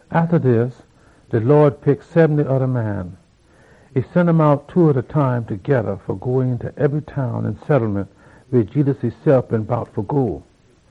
Atta dis, de Lawd pick sebenty oda man. E sen um out two by two fa go eenta ebry town an settlement weh Jedus esef been bout fa go.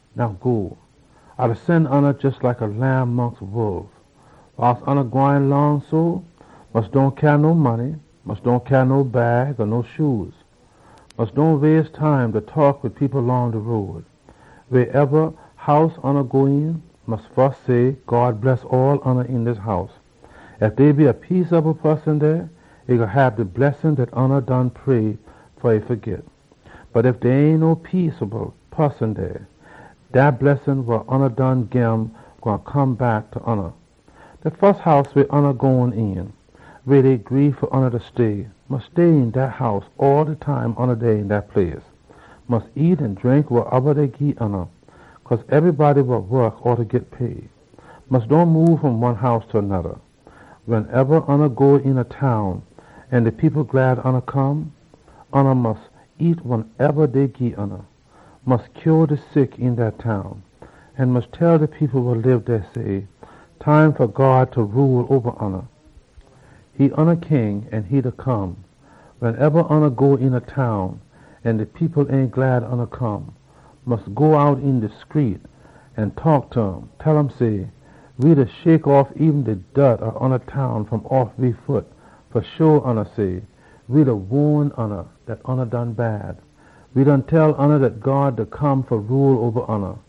Now go! A da sen oona out jes like lamb mongst wolf. Wiles oona gwine long so, mus dohn cyaa no money. Mus dohn cyaa no bag or no shoe. Mus dohn waste time da taak wid people long de road. Wasoneba house ya go een, mus fus say, ‘God bless all oona een dis house.’ Ef dey a peaceable poson dey, e gwine hab de blessin dat ya done pray fa um fa git. Bot ef dey ain no peaceable poson dey, dat blessin wa ya done gim gwine come back ta ya. De fus house weh ya gone een, weh dey gree fa leh ya stay, mus stay een dat house all de time ya dey een dat place. Mus nyam an drink wasoneba dey gii ya, cause ebrybody wa wok oughta git pay. Mus dohn moob fom one house ta noda. Wensoneba ya go een a town an de people glad ya come, ya mus nyam wasoneba dey gii ya. Mus heal de sick een dat town, an mus tell de people dey, say, ‘Time fa God fa rule oba oona da come.’ Wensoneba ya go een a town an de people ain glad ya come, mus go out een de screet an taak ta um. Tell um say, ‘We da shake off eben de dort ob oona town fom off we foot fa waan ya dat ya done bad. De time da come wen God gwine rule oba oona.’”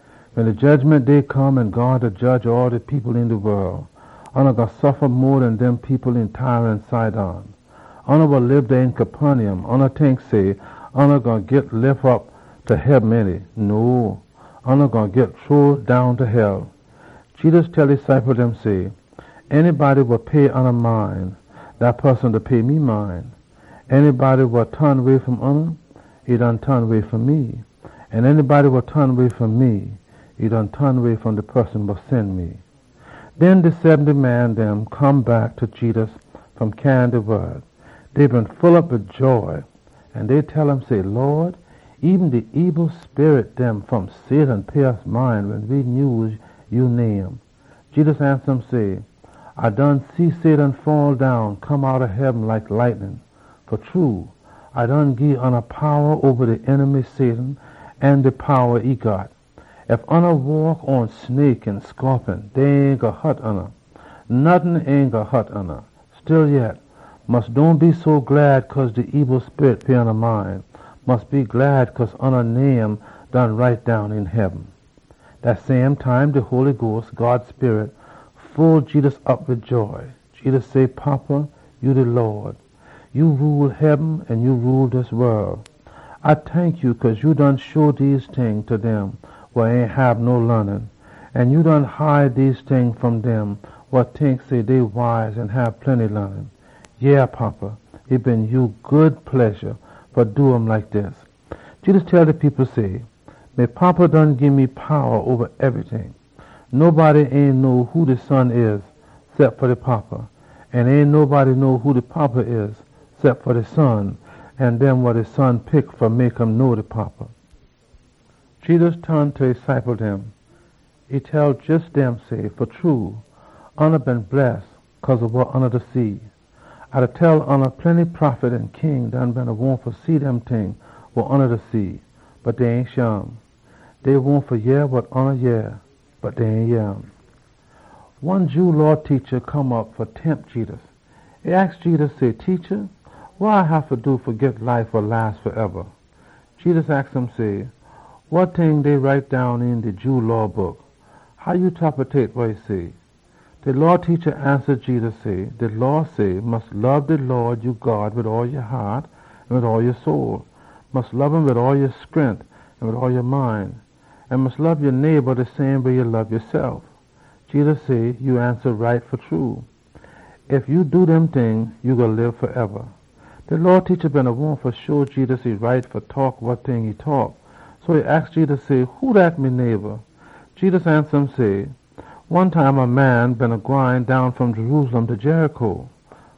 Wen de Jedgiment Day come an God da jedge all de people een de wol, oona gwine suffa mo den dem people een Tyre an Sidon! Oona wa lib dey een Capernaum, oona tink say, oona gwine git lif op ta heaben, ainty? No! Oona gwine git chunk down ta hell!” Jedus tell e ciple dem say, “Anybody wa pay oona mind, dat poson da pay me mind. Anybody wa ton way fom oona, e done ton way fom me. An anybody wa ton way fom me, e done ton way fom de one wa sen me.” Den de sebenty man dem come back ta Jedus. Dey been full op wid joy, an dey tell um say, “Lawd, eben de ebil sperit dem pay we mind wen we nyuse ya name!” Jedus ansa um say, “A done see Satan faddown, come outta heaben like lightnin. Fa true, A done gii oona powa oba de enemy an all de powa e got. Ef oona waak pon snake an scorpion, dey ain gwine hut oona. Nottin ain gwine hut oona. Stillyet, mus dohn be so glad cause de ebil sperit dem pay oona mind. Mus be glad cause oona name done been write down een heaben.” Dat same time, de Holy Sperit full Jedus op wid joy. Jedus say, “Fada, ya de Lawd. Ya da rule heaben an ya da rule dis wol! A tank ya cause ya done show dese ting ta dem wa ain hab no laanin. An ya done hide dese ting fom dem wa tink say, dey wise an hab plenty laanin. Yeah, Fada, e been ya good pledja fa do um like dis.” Jedus tell de people say, “Me Fada done gii me powa oba ebryting. Nobody ain know who de Son da, cep fa de Fada. An ain nobody know who de Fada da, cep fa de Son an dem wa de Son pick fa mek um know de Fada.” Jedus ton ta e ciple dem. E tell jes dem say, “Fa true, oona been bless cause ob wa oona da see! A da tell oona, plenty prophet an king done been wahn fa see dem ting wa oona da see, bot dey ain shim. Dey wahn fa yeh wa oona da yeh, bot dey ain yeh um.” One Jew Law teacha come op fa test Jedus. E aks Jedus say, “Teacha, wa A haffa do fa git life wa las faeba?” Jedus aks um say, “Wa ting dey write down een de Jew Law Book? How ya tapetate wa e say?” De Law teacha ansa Jedus say, “De Law say, ‘Mus lob de Lawd ya God wid all ya haat an wid all ya soul. Mus lob um wid all ya scrent an wid all ya mind. An mus lob ya neighba de same way ya lob yasef.’” Jedus say, “Ya ansa right, fa true. Ef ya do dem ting, ya gwine lib faeba.” De Law teacha been wahn fa sho Jedus e right fa taak wa e taak, so e aks Jedus say, “Who dat me neighba?” Jedus ansa um say, “One time a man beena gwine down fom Jerusalem ta Jericho.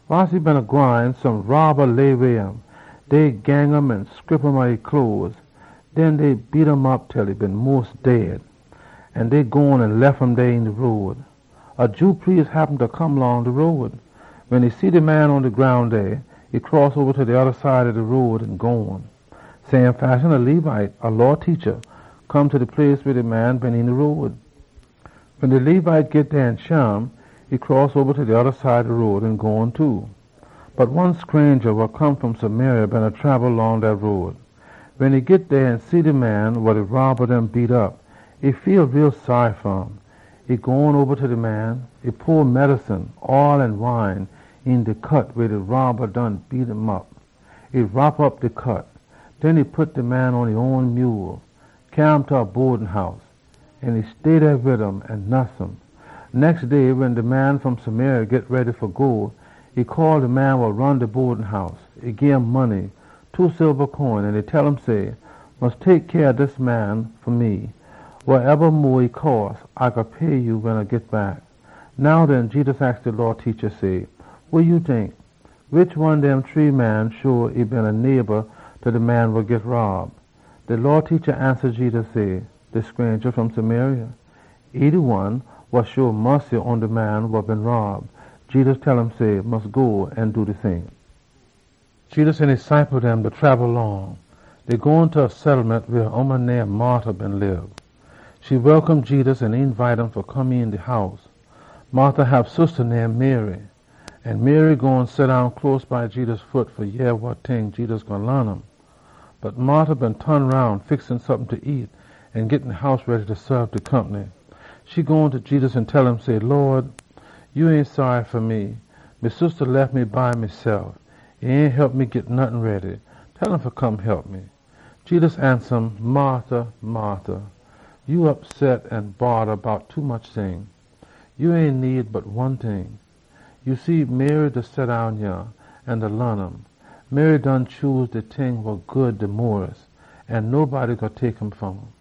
Wiles e beena gwine, some robba layway um. Dey gang um an scrip off e cloes. Den dey beat um op til e been mos dead. An dey gone an lef um dey een de road. A Jew priest come down de road. Wen e see de man pon de groun dey, e cross oba ta de oda side ob de road an gone. Same fashion, a Levite, a Law teacha, come ta de place weh de man been een de road. Wen de Levite git dey an shim, e cross oba ta de oda side ob de road an gone too. Bot one scranja wa come fom Samaria beena trabel long dat road. Wen e git dey an e see de man wa de robba beat op, e feel too saary fa um. E gone oba ta de man. E pour medicine, oll an wine, een de cut weh de robba done beat um op. E wrop op de cut. Den e pit de man pon e own mule, cyaa um ta a bodin house. An e stay dey wid um an nuss um. Nex day wen de man fom Samaria git ready fa go, e call de man wa ron de bodin house. E gim money, two silba coin, an e tell um say, ‘Mus tek cyah ob dis man fa me. Wasoneba mo e cost, A gwine pay ya wen A git back.’” “Now den,” Jedus aks de Law teacha, say, “Wa ya tink? Wish one dem shree man show e been a neighba ta de man wa git rob?” De Law teacha ansa Jedus say, “De scranja fom Samaria, de one wa hab mussy pon de man wa been rob.” Jedus tell um say, “Mus go an do de same.” Jedus an e ciple dem trabel long. Dey gone ta a settlement weh a ooman name Martha beena lib. E welcome Jedus an eenbite um fa come een de house. Martha hab sista name Mary, an Mary gone seddown close by Jedus foot fa yeh wa ting Jedus gwine laan um. Bot Martha beena ton roun, da fix sompin fa nyam an da git de house ready fa saab de compny. E gone ta Jedus an tell um say, “Lawd, ya ain saary fa me? Me sista lef me by mesef. E ain hep me git nottin ready. Tell um fa come hep me!” Jedus ansa um, “Martha, Martha, ya opsot an bodda bout tommuch ting. Ya ain need bot one ting. Ya see Mary da seddown yah an A da laan um. Mary done pick de good ting, an ain nobody gwine tek um fom um.”